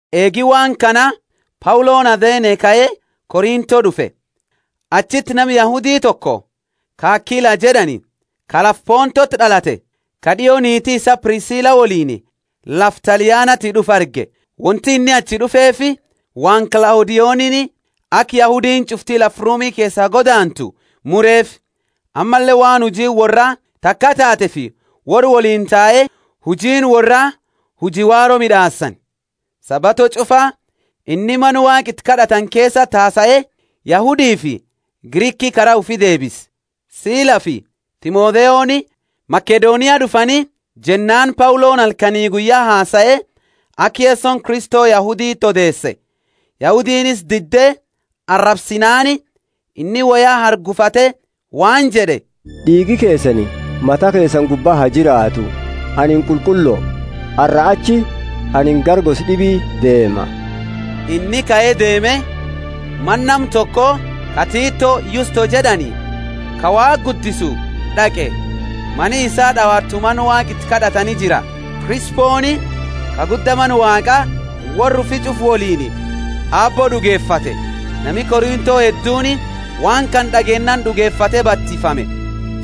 Eegi waan kana Pauloni Athene kae Korintho d'ufe. Achiti nama Yahudi toko, ka Akila jed'ani, ka lafa Pontoti d'alate, ka d'io niiti isaa Prisila woliini lafa Talianati d'ufe arge. Wonti inni achi d'ufeefi waan Klaudionini aka Yahudiini ch'ufti lafa Rumi keesaa godaantu mureefi. Ammalle waan hujiini worraa taka taateefi worra woliini tae; hujiini worraa huji waaro mid'aasani. Sabato ch'ufa inni mana Waaqa iti kad'atani keesati hasae, Yahudifi Griki kara ufi deebise. Silafi Timotheoni Makedonia d'ufani jennaani Pauloni halkani guyya hasae, aka Yesoni Kristo Yahuditi odeese. Yahudiini isa didde arabsinaani, inni woya hargufate waan jed'e, D'iigi keesani mata keesani gubba ha jiraatu, anini qulqullo, arraa achi anini gara gosa d'ibi deema. Inni kae deeme, mana nama toko, ka Tito Yusto jed'ani, ka Waaqa guddisu d'aqe. Mani isaa d'awatu mana Waaqa iti kad'atani jira. Krisponi, ka gudda mana Waaqaa, worra ufi ch'ufa woliini Aabbo d'ugefate. Nami Korintho hedduuni waan kana d'ageennaani d'ugefate batifame.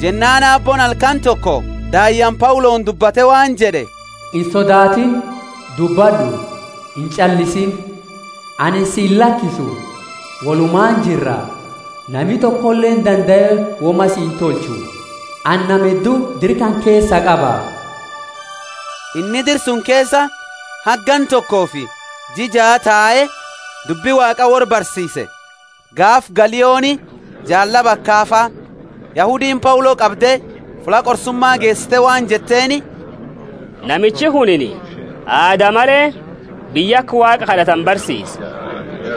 Jennaani Aabbooni halkani toko daayyaani Pauloni dubbate waan jed'e, Insodaatini, dubbad'u, inch'aliisiini. Anini si illakisu, wolumaani jirra, nami tokoleeni dandae woma si intolchu, anini nama heddu dira kana keesaa qaba. Inni dira suni keesa haga ganna tokofi jia jaa tae dubbi Waaqa worra barsiise. Gaafa Galioni jaallaba Akafa, Yahudiini Paulo qabde fulla qorsuma geesite waan jetteeni, Namichi kunini aada male biyya aka Waaqa kad'atani barsiisa!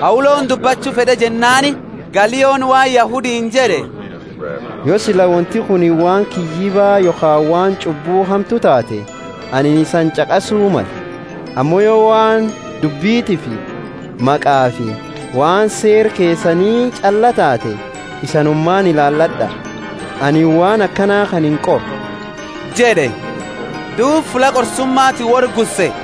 Pauloni dubbachu fed'e jennaani Galioni waan Yahudiini jed'e, Yo sila wonti kunini waan kiyyiba yokhaani waan ch'ubbu hamtu taate anini isani ch'aqasu male. Ammo yo waan dubbitiifi maqafi waan seera keesani ch'allaa taate, isanumaani ilaalad'a. Anini waan akana kana inqoru jed'e. Duuba fulla qorsumati worra gusse.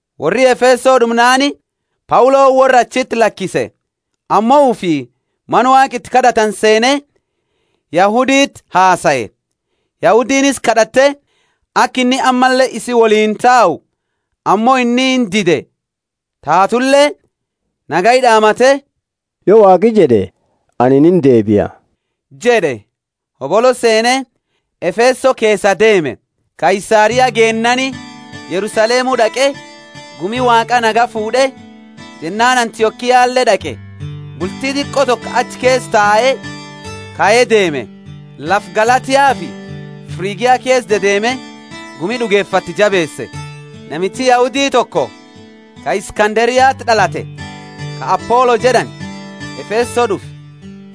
Worri Efeso d'umnaani, Pauloni worra achiti lakise. Ammo ufii mana Waaqa iti kad'atani seene Yahuditi hasae. Yahudiini isa kad'atte aka inni ammalle isii woliini tau, ammo inni indide. Taatule nagaya d'aamate, Yo Waaqi jed'e anini indeebia jed'e, hobolo seene Efeso keesaa deeme. Kaisaria geennaani Yerusalemu d'aqe, gumi Waaqa nagaya fuud'e, jennaani Antiokiale d'aqe. Bulti diqo toko achi keesa tae kae deeme. Lafa Galatiafi Frigia keesa dedeeme gumi d'ugefatte jabeese. Namichi Yahudi toko ka Iskanderiati d'alate, ka Apolo jed'ani, Efeso d'ufe.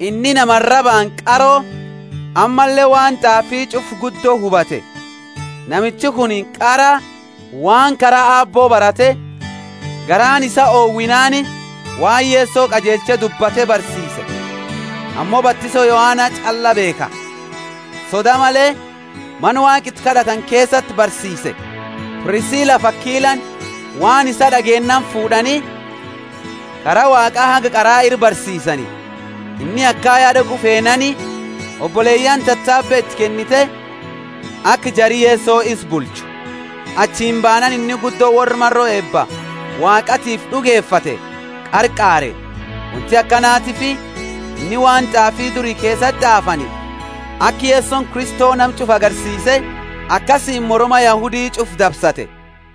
Inni nama arabaani qaro ammalle waan t'aafi ch'ufa guddo hubate. Namichi kunini qara waan kara Aabbo barate, garaani isaa owinaani waan Yeso qajeelche dubbate barsiise, ammo batiso Yohana ch'allaa beekha. Soda male mana Waaqa iti kad'atani keesati barsiise. Prisilafi Akilani waan isaa d'ageennaani fuud'ani, Kara Waaqa haga qara ira barsiisani. Inni Akaya d'aqu feenaani, oboleyaani tatabe iti kennite aka jari Yeso isa bulchu. Achini baanaani inni guddo worra maro eeba Waaqatiifi d'ugefate qarqaare. Wonti akanatiifi inni waan t'aafi duri keesati t'aafani aka Yesoni Kristo nama ch'ufa agarsiise, akasiini moroma Yahudi ch'ufa dabsate.